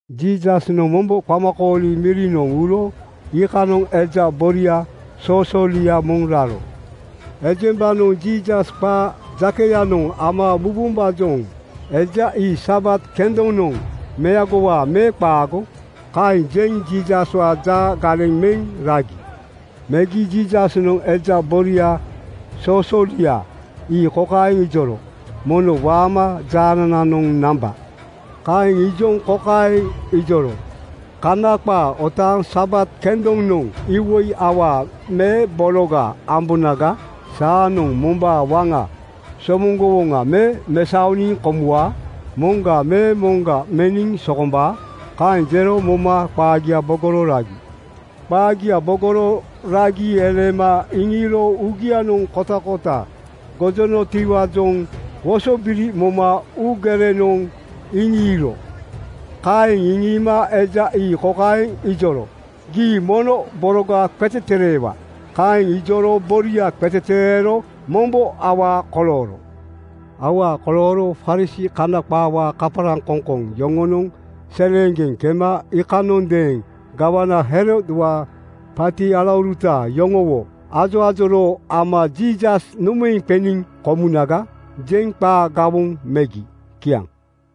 Jiisasnoŋ mombo qamakooli mirinoŋ uro iikanoŋ eja boria soosoolia moŋ raro. Ejembanoŋ Jiisas qaa jakeyanoŋ ama mubombaajoŋ “Eja ii Sabat kendonoŋ meagowaa me qaago?” kaeŋ jeŋ Jiisaswaa jaa galeŋ meŋ ragi. Megi Jiisasnoŋ eja boria soosoolia ii kokaeŋ ijoro, “Mono waama jaanananoŋ namba.” Kaeŋ ijoŋ kokaeŋ iŋijoro, “Kana qaa otaaŋ Sabat kendonoŋ iwoi awaa me bologa ambonaga? Saanoŋ mombaa waŋa somoŋgowoŋa me mesaoniŋ komuwaa? Moŋga me moŋga meniŋ sokombaa?” Kaeŋ jero moma qaagia bogoro ragi. Qaagia bogoro ragi eleema iŋiiro uugianoŋ kotakota gojonotiwaajoŋ wosobiri moma uugerenoŋ iŋiiro. Kaeŋ iŋiima eja ii kokaeŋ ijoro, “Gii mono boroga qetetereewa.” Kaeŋ ijoro boria qetetereero mombo awaa kolooro. Awaa kolooro Farisii (Kana qaawaa kaparaŋkoŋkoŋ) yoŋonoŋ seleeŋgeŋ kema iikanondeeŋ gawana Herodwaa paati alauruta yoŋowo ajoajoroo ama “Jiisas nomaeŋ qeniŋ komunaga?” jeŋ qaa gawoŋ megi. Kiaŋ.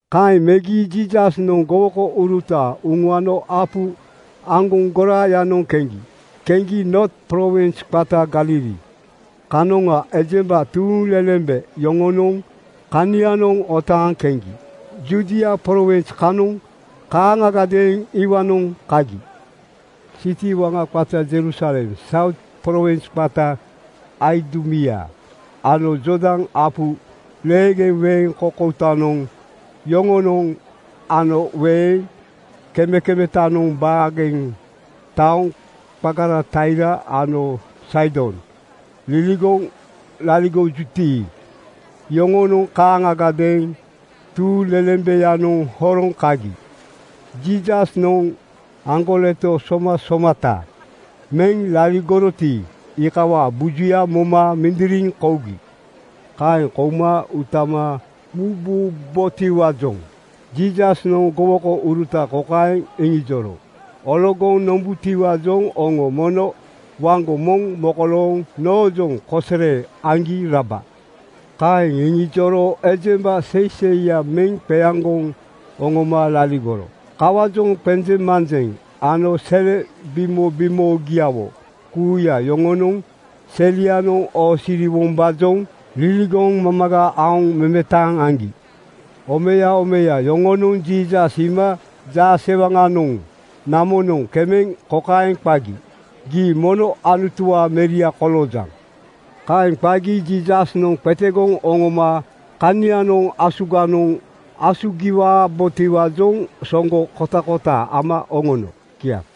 Kaeŋ megi Jiisasnoŋ gowokouruta uŋuano apu aŋgoŋ goraayanoŋ keŋgi. Keŋgi Noot prowins qata Galili kanoŋa ejemba tuuŋlelembe yoŋonoŋ kanianoŋ otaaŋ keŋgi. Judia prowins kanoŋa kaaŋagadeeŋ iwaanoŋ kagi. Siti waŋa qata Jerusalem, Saut prowins qata Aidumia ano Jordan apu leegeŋga weeŋ koukoutanoŋ yoŋonoŋ ano weeŋ kemekemetanoŋ baageŋga taoŋ qagara Taia ano Saidon liligoŋ laligojuti, iyoŋonoŋ kaaŋagadeeŋ tuuŋlelembeyanoŋ horoŋ kagi. Jiisasnoŋ aŋgoleto somasomata meŋ laligoroti, iikawaa bujuya moma mindiriŋ kougi. Kaeŋ kouma utama mububotiwaajoŋ Jiisasnoŋ gowokouruta kokaeŋ iŋijoro, “Ologoŋ nombutiwaajoŋ oŋo mono waŋgo moŋ mokolooŋ noojoŋ kosere aŋgi raba.” Kaeŋ iŋijoro ejemba seiseiya meŋ qeaŋgoŋ oŋoma laligoro. Kawaajoŋ qenjeŋmanjeŋ ano sele bimobimoogiawo kuuya yoŋonoŋ selianoŋ oosiriwombaajoŋ liligoŋ mamaga aoŋ memetaŋ aŋgi. Omeya omeya yoŋonoŋ Jiisas iima jaasewaŋanoŋ namonoŋ kemeŋ kokaeŋ qagi, “Gii mono Anutuwaa Meria koloojaŋ!” Kaeŋ qagi Jiisasnoŋ qetegoŋ oŋoma kanianoŋ asuganoŋ asugiwabotiwaajoŋ soŋgo kotakota ama oŋono. Kiaŋ.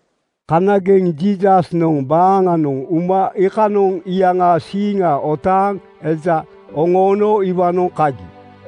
Kanageŋ Jiisasnoŋ baaŋanoŋ uma iikanoŋ iyaŋaa siiŋa otaaŋ eja oŋoono iwaanoŋ kagi.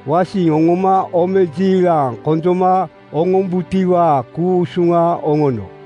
Wasiŋ oŋoma omejiilaŋ konjoma oŋombutiwaa ku-usuŋa oŋono.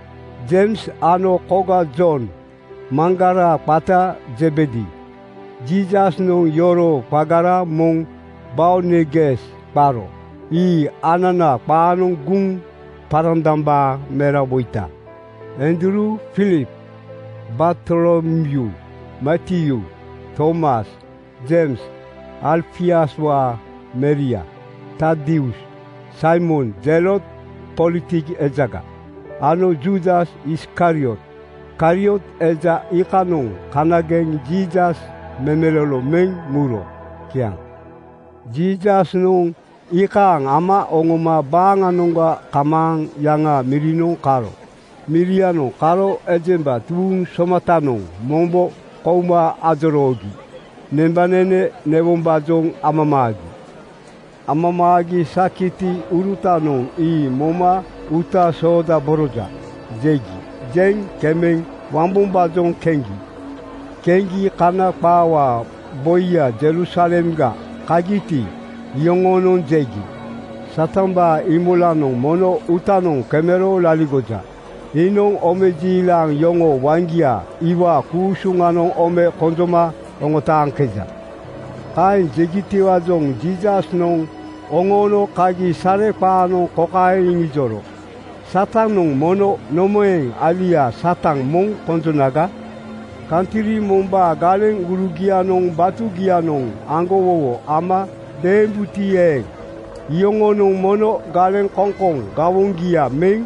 Jeims ano koga Jon, maŋgara qata Zebedi. Jiisasnoŋ yoroo qagara moŋ Boanerges qaro. Ii ananaa qaanoŋ Guŋparandambaa Merawoita. Andruu, Filip, Bartolomyuu, Matyuu, Tomas, Jeims Alfiuswaa meria, Tadius, Saimon Zelot-politik ejaga, ano Juudas Iskariot. Kariot eja iikanoŋ kanageŋ Jiisas memelolo meŋ muro. Kiaŋ. Jiisasnoŋ iikaaŋ ama oŋoma baaŋanoŋga kamaaŋ yaŋaa mirinoŋ karo. Mirinoŋ karo ejemba tuuŋ somatanoŋ mombo kouma ajoroogi nembanene newombaajoŋ amamaagi. Amamaagi sakitiurutanoŋ ii moma “Uuta soodaboroja!” jegi. Jeŋ kemeŋ wambombaajoŋ keŋgi. Keŋgi Kana qaawaa boiya Jerusalemga kagiti, iyoŋonoŋ jegi, “Satambaa Iimolanoŋ mono uutanoŋ kemero laligoja. Iinoŋ omejiilaŋ yoŋoo waŋgia iwaa ku-usuŋanoŋ ome konjoma oŋotaaŋkeja.” Kaeŋ jegitiwaajoŋ Jiisasnoŋ oŋoono kagi sareqaanoŋ kokaeŋ iŋijoro, “Satanoŋ mono nomaeŋ alia Satan moŋ konjonaga? Kantri mombaa galeŋurugianoŋ batugianoŋ aŋgowowo ama deembuti eeŋ, iyoŋonoŋ mono galeŋkoŋkoŋ gawoŋgia meŋ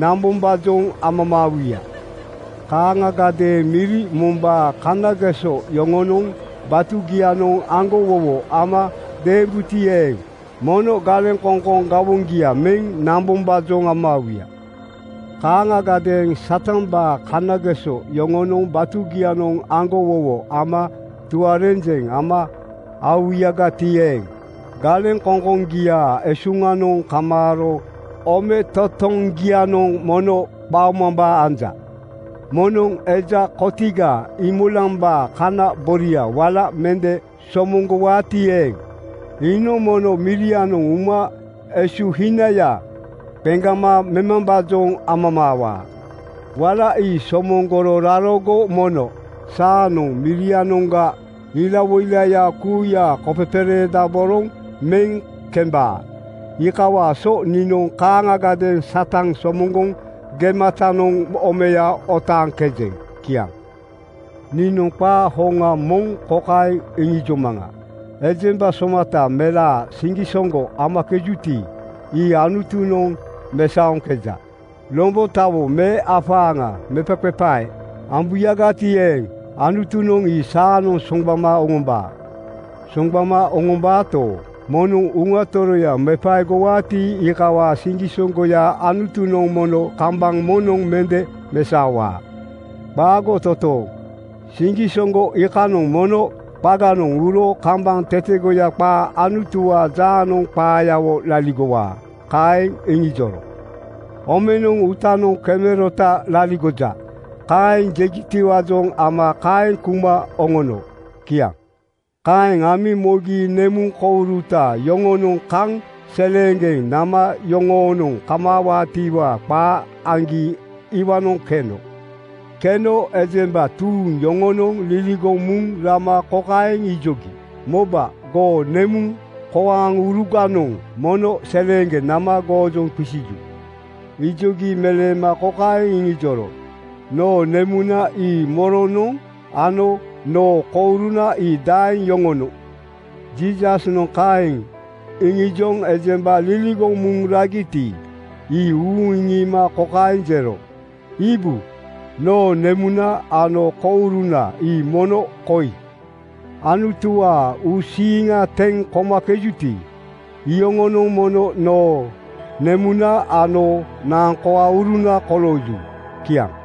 nambombaajoŋ amamaawuya. Kaaŋagadeeŋ miri mombaa kanageso yoŋonoŋ batugianoŋ aŋgowowo ama deembuti eeŋ, mono galeŋkoŋkoŋ gawoŋgia meŋ nambombaajoŋ amamaawuya. Kaaŋagadeeŋ Satambaa kanageso yoŋonoŋ batugianoŋ aŋgowowo ama tuarenjeŋ ama aowuyagati eeŋ, galeŋkoŋkoŋgiaa esuŋanoŋ kamaaro ometotoŋgianoŋ mono qaomambaa anja. “Moŋnoŋ eja kotiga Iimolambaa kana boria wala mende somoŋgowaati eeŋ, iinoŋ mono mirianoŋ uma esuhinaya qeŋgama memambaajoŋ amamaawaa. Wala ii somoŋgoro rarogo mono saanoŋ mirianoŋga ilawoilaya kuuya kopepereedaboroŋ meŋ kembaa. (Iikawaa so niinoŋ kaaŋagadeeŋ Satan somoŋgoŋ gematanoŋ omeya oŋotaaŋkejeŋ.”) Kiaŋ. Niinoŋ qaa hoŋa moŋ kokaeŋ iŋijomaŋa, “Ejemba somata melaa siŋgisoŋgo amakejuti, ii Anutunoŋ mesaoŋkeja. Lombotawo me afaaŋa mepaqepae ambuyagati eeŋ, Anutunoŋ ii saanoŋ soŋgbama oŋombaa. Soŋgbama oŋombaato, moŋnoŋ Uŋa Toroya mepaegowaati, iikawaa siŋgisoŋgoya Anutunoŋ mono kambaŋ moŋnoŋ mende mesaowaa. Qaago totooŋ! Siŋgisoŋgo iikanoŋ mono qaganoŋ uro kambaŋ tetegoya qaa Anutuwaa jaanoŋ qaayawo laligowaa.” Kaeŋ iŋijoro. “Omenoŋ uutanoŋ kemerota laligoja,” kaeŋ jegitiwaajoŋ ama kaeŋ kuma oŋono. Kiaŋ. Kaeŋ amiŋ mogi nemuŋkoaŋuruta yoŋonoŋ kaŋ seleeŋgeŋ nama yoŋoonoŋ kamaawaatiwaa qaa aŋgi iwaanoŋ keno. Keno ejemba tuuŋ yoŋonoŋ liligoŋ muŋ rama kokaeŋ ijogi, “Moba! Goo nemuŋkoaŋuruganoŋ mono seleeŋgeŋ nama goojoŋ qisiju.” Ijogi meleema kokaeŋ iŋijoro, “Noo nemuna ii moronoŋ ano noo kouruna ii daeŋ yoŋonoŋ?” Jiisasnoŋ kaeŋ iŋijoŋ ejemba liligoŋ muŋ ragiti, ii uuŋ iŋiima kokaeŋ jero, “Iibu! Noo nemuna ano kouruna ii mono koi. Anutuwaa uusiiŋa teŋ komakejuti, iyoŋonoŋ mono noo nemuna ano naaŋkoaŋuruna kolooju.” Kiaŋ.